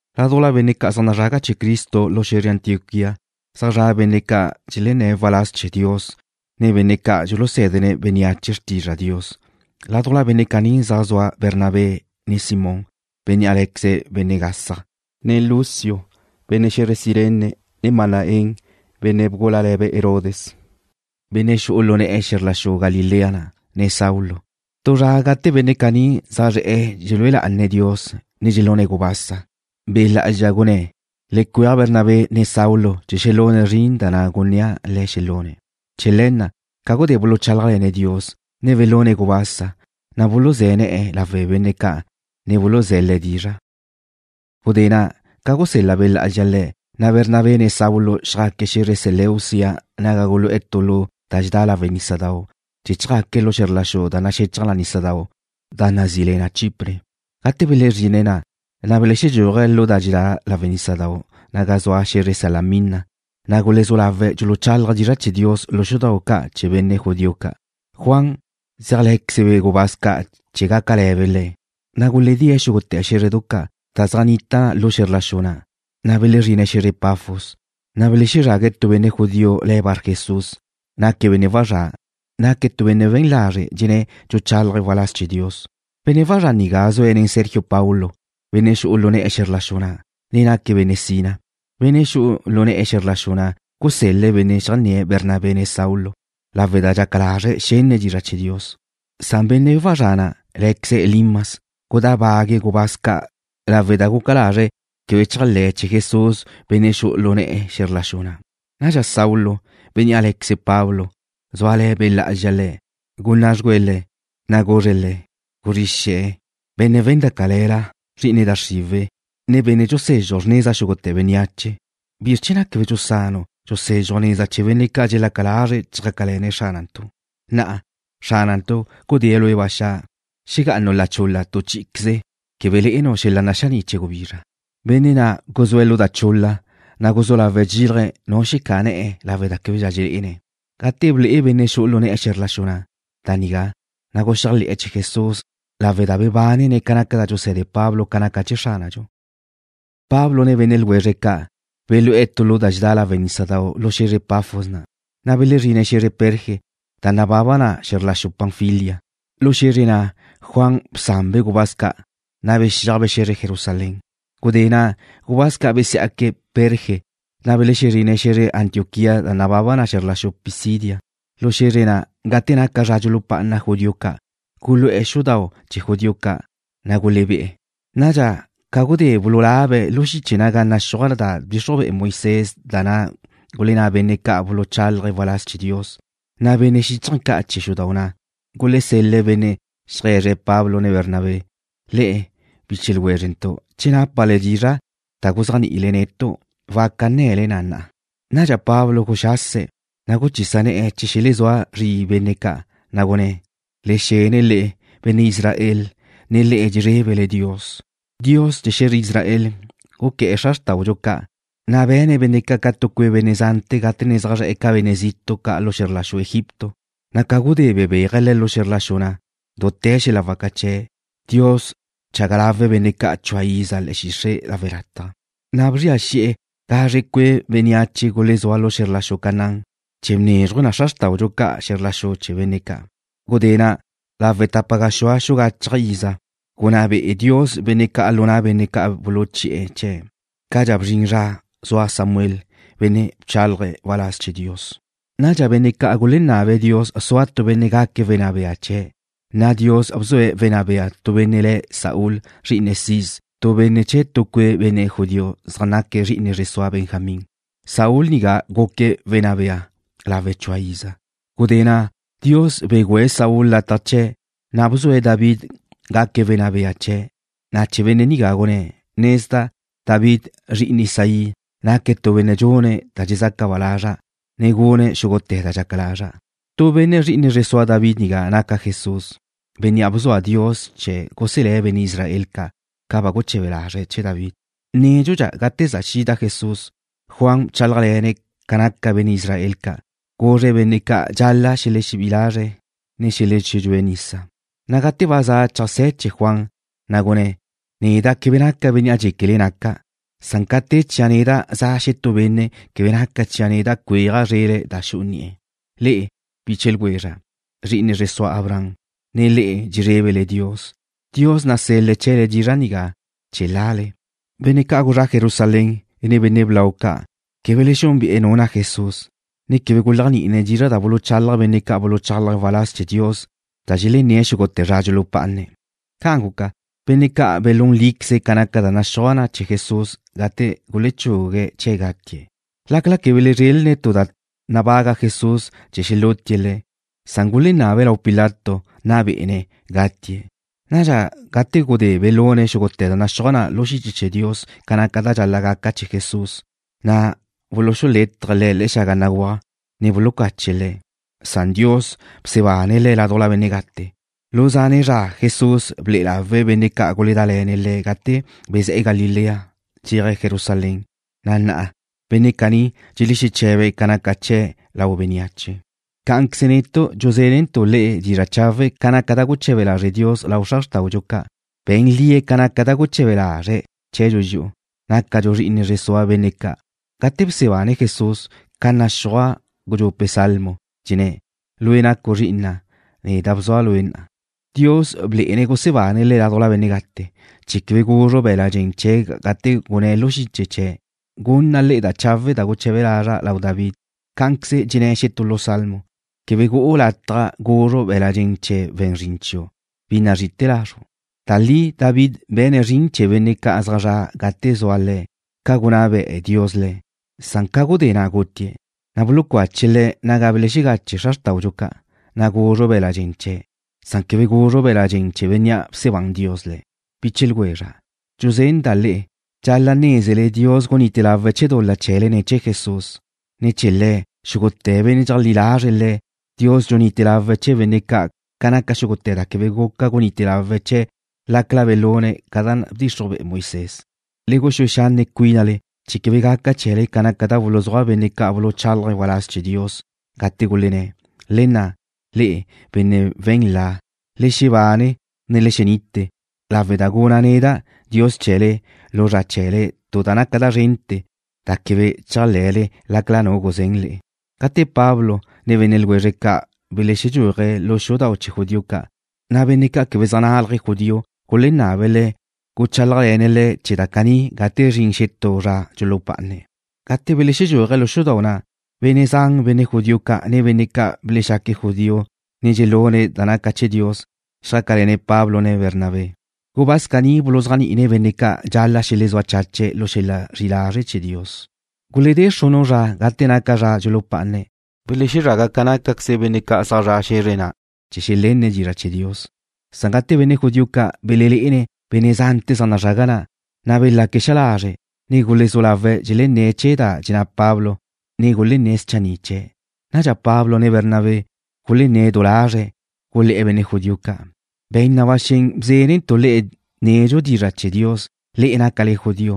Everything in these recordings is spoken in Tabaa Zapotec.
Ládujla benne' ca' zaj nazraga chee̱ Cristo lu xe̱zre Antioquía zaj zra' benne' ca' dxelenné̱' waláz chee̱ Dios, ne benne' ca' dxulusé̱dene̱' bénneache xrtizra' Dios. Ládujla benne' caní zaj zua Bernabé, ne Simón, bénnea' lé̱queze̱' benne' gasaj, ne Lucio, benne' xe̱zre Cirene, ne Manaén, benne' gúlale̱be' Herodes, benne' xu'u lu ne̱'e̱ xe̱zr la xu Galilea na', ne Saulo. Tu zra gate benne' caní zaj zre̱'e̱ dxelúe lá'ane̱' Dios, ne dxelune̱' gubasa, Be' Lá'azxa gunné̱': ―Le cueaj Bernabé, ne Saulo chee̱ xelune̱' zrin na' da gunnéa' le̱' xelune̱'. Chee̱ le̱ na', ca gudé buluchálajle̱ne̱' Dios, ne belune̱' gubasa, na' buluzé̱ ne̱'e̱ lawe' benne' ca', ne buluzé̱' le̱' dizra'. Gudé na', ca gusel-la Be' Lá'azxa le̱', na' Bernabé, ne Saulo xjaque̱' xe̱zre Seleucia naga gulu'e̱ tu lu da dxedá lawe' nísadau' chee̱ chjaque̱' lu xe̱zr la xu da naxechaj nísadau' da nazí le na Chipre. Gate belezrine̱' na', na' belexedxúaje̱' lu da dxedá lawe' nísadau' naga zua xe̱zre Salamina, na' gulezú lawe̱' dxuluchálaje̱' dizra' chee̱ Dios lu xudau' ca' chee̱ benne' judío ca'. Juan zéajle̱quezebe' gubáz ca' chee̱ gácale̱be' le̱'. Na' guledée̱' xúgute̱ xé̱zredu ca' da zaj nnita lu xe̱zr la xu na', na' belezrine̱' xe̱zre Pafos. Na' belexezrague̱' tu benne' judío le̱' Barjesús, naque̱' benne' wazrá'. Naque̱' tu benne' we̱n lazre' dxenné̱' dxuchálaje̱' waláz chee̱ Dios. Benne' wazrá' nigá zue̱' nen Sergio Paulo, benne' xu'u lu ne̱'e̱ xe̱zr la xu na', ne naque̱' benne' sina. Benne' xu'u lu ne̱'e̱ xe̱zr la xu na' gusel-le̱' benne' xeajnné̱' Bernabé, ne Saulo lawe' da dxaca lazre̱' xenne̱' dizra' chee̱ Dios. Na' benne' wazrá' na', lé̱queze̱' Elimas gudábague̱' gubáz ca' lawe' da guca lazre̱' quebe chéajle̱ chee̱ Jesús benne' xu'u lu ne̱'e̱ xe̱zr la xu na'. Nadxa Saulo, bénnea' lé̱queze̱' Pablo, zúale̱ Be' Lá'azxa le̱', gunná' dxugüe̱' le̱', na' guzre̱' le̱': ―Guzrí xe̱, benne' we̱n da cale̱la. Zri'ine da xriwe̱', ne benne' dxusezxuj xrneza xúgute̱ bénneache. ¿Bizr chee̱ na' quebe dxusanu' dxusézxuju' neza chee̱ benne' ca' dxelaca lazre̱' chjácale̱ne̱' Xránantu'? Na'a, Xránantu' gudée̱' lue' ba xa'. Xegá'anu' la chul-la, na' tu chí'iqueze quebe le'enu' xel-la' naxaní' chee̱ gubizra. Benne' na' guzúe̱' lu da chul-la, na' guzú lawe̱' dxílaje̱' nu xecá'a ne̱'e̱ lawe' da québedxa dxelé'ene̱'. Gate ble'e benne' xu'u lu ne̱'e̱ xe̱zr la xu na' da nigá, na' guxéajle̱'e̱ chee̱ Jesús lawe' da bebánene̱' ca naca da dxuse̱de Pablo ca naca chee̱ Xránadxu. Pablo ne benne' ljwezre̱' ca' belú'e̱ tu lu da dxedá lawe' nísadau' lu xe̱zre Pafos na', na' belezrine̱' xe̱zre Perge da nababa na xe̱zr la xu Panfilia. Lu xe̱zre na' Juan bsanbe' gubáz ca', na' bexíajbe' xe̱zre Jerusalén. Gudé na' gubáz ca' besiá'que̱' Perge, na' belezrine̱' xe̱zre Antioquía da nababa na xe̱zr la xu Pisidia. Lu xe̱zre na', gate naca zra dxulupá'ana judío ca', gulu'e̱ xudau' chee̱ judío ca', na' gulebé'e̱. Nadxa, ca gudé bululabe̱' lu xiche naga naxúaj da bdxixruj bea Moisés, ne da gulenná benne' ca' buluchálaje̱' waláz chee̱ Dios, na' benne' xíchaje̱ ca' chee̱ xudau' na' gulesel-le̱' benne' xeaje̱zre̱' Pablo, ne Bernabé: ―Le'e, biche ljwézrentu', che nápale dizra' da guzéajni'ile netu', waca nne̱le na na'a. Nadxa Pablo guxase̱', na' guchisa ne̱'e̱ chee̱ xelezúa zri benne' ca', na' gunné̱': ―Le xene le'e, benne' Israel, ne le'e dxezrébele Dios. Dios chee̱ xe̱zre Israel guqué̱'e̱ xra xrtáudxu ca', na' be̱ne̱' benne' ca' tu cue' benne' zante̱ gate ne zaj zre̱'e̱ ca benne' zitu' ca' lu xe̱zr la xu Egipto, na' ca gudé na' bebéaje̱' le̱' lu xe̱zr la xu na' dute̱ xel-la' waca chee̱'. Dios bchaga lawe̱' benne' ca' chua iza le̱'e̱ xixre' lawe' lataj, na' bzria xi'e̱ gazre cue' bénneache gulezúa lu xe̱zr la xu Canaán, chee̱ bnézruje̱' xra xrtáudxu ca' xe̱zr la xu chee̱ benne' ca'. Gudé na', lawe' tapa gaxúa xu gachaj iza gunná be'e Dios benne' ca' lu na' benne' ca' buluchi'e̱ chee̱', cadxa bzrin zra zua Samuel, benne' bchálaje̱' waláz chee̱ Dios. Nadxa benne' ca' gulenabe̱' Dios sua tu benne' gaque̱' wenná bea chee̱', na' Dios bzue̱' wenná bea tu benne' le̱' Saúl, zri'ine Cis, tu benne' chee̱ tu cue' benne' judío zaj naque̱' zri'ine zre sua Benjamín. Saúl nigá guque̱' wenná bea lawe' chua iza. Gudé na' Dios begüe̱' Saúl lataj chee̱', na' bzue̱' David gaque̱' wenná bea chee̱', na' chee̱ benne' nigá gunné̱': “Nezda' David, zri'ine Isaí, naque̱' tu benne' dxune̱' da dxezaca ba lazra', ne gune̱' xúgute̱ da dxaca lazra'.” Tu benne' zri'ine zre sua David nigá naca Jesús, bénnea' bzua Dios chee̱ guselé̱' benne' Israel ca', ca ba guche̱be lazre̱' chee̱ David. Nédxudxa gate za xida Jesús, Juan bchálajle̱ne̱' ca naca benne' Israel ca', guzre̱' benne' ca' dxal-la' xelexebí'i lazre̱', ne xelexedxúe̱' nisa. Na' gate ba za cheajsé̱ chee̱ Juan, na' gunné̱': “Neda' quebe naca' bénnea' dxéquele naca', san ca te chia' neda' za xetú benne' quebe naca chia' neda' cuéaja' zrele̱' da xu'u ni'e̱.” ’Le'e, biche ljwezra', zri'ine zre sua Abraham, ne le'e dxezrébele Dios. Dios nasel-le̱' chee̱le dizra' nigá chee̱ lale. Benne' ca' gulezrá' Jerusalén, ne benne' blau chee̱' ca', quebe belexúnbe'e̱ nu na' Jesús, ne quebe guléajni'ine̱' dizra' da buluchalaj benne' ca' buluchálaje̱' waláz chee̱ Dios da dxelenne̱' xúgute̱ zra dxulupá'ane̱'. Ca' guca, benne' ca' belún líqueze̱' ca naca da naxúaj na chee̱ Jesús gate gulechugue̱' chee̱' gatie̱'. Lácala quebe belezrelne̱' tu da nabaga Jesús chee̱ xelútie̱' Le̱', gulenabe̱' lau Pilato nna bé'ene̱' gatie'. Nadxa, gate gudé belune̱' xúgute̱ da naxúaj na lu xiche chee̱ Dios ca naca da dxal-la' gaca chee̱ Jesús, na' buluxulétaje̱' Le̱' xaga béguaj, ne bulucache̱' Le̱'. Nadxa Dios bsebane̱' Le̱' ládujla benne' gate. Lu zane' zra Jesús ble'e lawe̱' benne' ca' guledále̱ne̱' Le̱' gate bezé̱'e̱ Galilea dxeaje̱' Jerusalén, na' na'a, benne' caní dxelexeche̱be̱' ca naca chee̱' lau bénneache. ’Cá'anqueze netu' dxuzénentu' le'e dizra' chawe' ca naca da guche̱be lazre' Dios lau xra xrtáudxu ca'. Be̱n lie̱' ca naca da guche̱be lazre̱' chee̱dxu dxi'u, nácadxu zri'ine zre sua benne' ca', gate bsebane̱' Jesús, ca naxúaj gudxupe' salmo, dxenné̱': “Lue' nacu' zri'ina'. Neda' bzua' Lue' na'a.” Dios blé'ene̱' gusebane̱' Le̱' ládujla benne' gate, chee̱ quebe guzru be̱l-la' dxen chee̱' gate gunné̱' lu xiche chee̱': “Gunna' le'e da chawe' da guche̱be lazra' lau David.” Cá'anqueze dxenné̱' xetú lu salmo: “Quebe gu'u lataj guzru be̱l-la' dxen chee̱ we̱n zrin chiu', bi nazri'ite̱ lazru'.” Da li David be̱ne̱' zrin chee̱ benne' ca' zaj zre̱'e̱ gate zua le̱', ca gunná be'e Dios le̱', san ca gudé na' gutie̱', na' bulucache̱' le̱' naga belegache xra xrtawe̱' ca', na' guzru be̱l-la' dxen chee̱'. Quebe guzru be̱l-la' dxen chee̱ Bénnea' bsebán Dios Le̱'. Biche ljwezra', dxuzenda' le'e, dxal-la' nézele Dios gunite lawe̱' chee̱ dul-la chee̱le ne̱ chee̱ Jesús. Ne̱ chee̱ Le̱', xúgute̱ benne' dxeleajlí lazre̱' Le̱', Dios dxunite lawe̱' chee̱ benne' ca' ca naca xúgute̱ da quebe guca gunite lawe̱' chee̱' lácala belune̱' ca naca da bdxixruj be'e Moisés. Le guxúe xanne' cuínale chee̱ quebe gaca chee̱le ca naca da buluzúaj benne' ca' buluchálaje̱' waláz chee̱ Dios, gate gulenné̱': Le nna', le'e, benne' we̱n la, ne le xebane, ne le xenite, lawe' da guna' neda', Dios chee̱le, lu zra chee̱le, tu da naca da zrente̱, da quebe chéajle̱le lácala nu guzén le'e. Gate Pablo ne benne' ljwezre̱' ca' belexedxúaje̱' lu xudau' chee̱ judío ca', na' benne' ca' quebe zaj nálaje̱' judío gulenabe̱' le̱' guchálajle̱ne̱' le̱' chee̱ da caní gate zrin xetú zra dxulupá'ane̱'. Gate belexedxúaje̱' lu xudau' na', benne' zan benne' judío ca', ne benne' ca' belexaque̱' judío, ne dxelune̱' da naca chee̱ Dios, xjácale̱ne̱' Pablo ne Bernabé. Gubáz caní buluzéajni'ine̱' benne' ca' dxal-la' xelezúa chache̱' lu xel-la' zri'i lazre' chee̱ Dios. Guledé xrunu' zra gate naca zra dxulupá'ane̱', belezraga ca nácaqueze benne' zaj zre̱'e̱ xe̱zre na' chee̱ xelenne̱' dizra' chee̱ Dios. Gate benne' judío ca' belelé'ene̱' benne' zante̱ zaj nazrague̱' na', na' belaque̱' xa lazre' ne gulezú lawe̱' dxelenné̱' chee̱ da dxenná Pablo, ne gulenné̱' schanni' chee̱'. Nadxa Pablo ne Bernabé gulenné̱' du lazre̱', gulé̱'e̱ benne' judío ca': ―Be̱n na ba xen bzénentu' le'e nedxu dizra' chee̱ Dios, le'e nácale judío,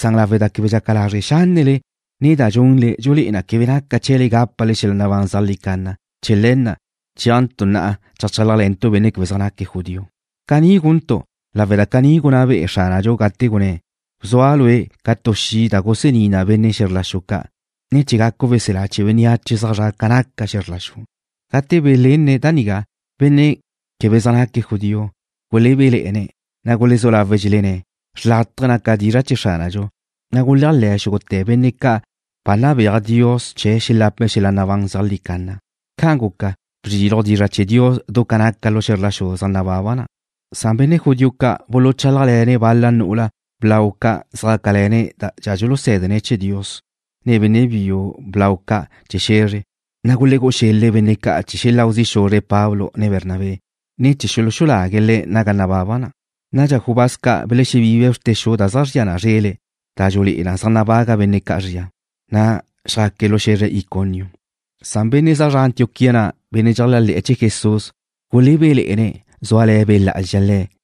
san lawe' da quebe dxaca lázrele xénele, ne da dxunle dxulé'e na quebe naca chee̱le gápale xel-la' nabán zeajlí canna, chee̱ le̱ na' chéajntu' na'a chálajle̱ntu' benne' quebe zaj naque̱' judío. Caní guntu' lawe' da caní gunná bea Xránadxu gate gunné̱': Bzua' Lue' ca tu xi' da gusení na benne' xe̱zr la xu ca', ne chee̱ gacu' weselá chee̱ bénneache zaj zre̱'e̱ ca naca xe̱zr la xu. Gate belenne̱' da nigá, benne' quebe zaj naque̱' judío gulebéle̱'e̱ne̱', na' gulezú lawe̱' dxelenné̱' xrlátaje naca dizra' chee̱ Xránadxu, na' guléajle̱ xúgute̱ benne' ca' ba nabéaj Dios chee̱ xelape̱' xel-la' nabán zeajlí canna. Ca' guca, bzriluj dizra' chee̱ Dios du ca naca lu xe̱zre ca' zaj nababa na'. Benne' judío ca' buluchálajle̱ne̱' bal-la nu'ula blau ca' zjácale̱ne̱' da dxulusé̱dene̱' chee̱ Dios, ne benne' biu blau ca' chee̱ xe̱zre, na' gulegú'u xel-le̱' benne' ca' chee̱ xeláu zi' xuzre̱' Pablo, ne Bernabé, ne chee̱ xuluxulague̱' le̱' naga nababa na'. Nadxa gubáz ca' belexebibe̱' bxrte xu da zeajzría na zrele̱' da dxulé'e na zaj nabaga benne' ca' zria, na' xjaque̱' lu xe̱zre Iconio. Gulebéle̱'e̱ benne' zaj zre̱'e̱ Antioquía na', benne' dxeléajle̱'e̱ chee̱ Jesús, zúale̱ Be' Lá'azxa le̱'.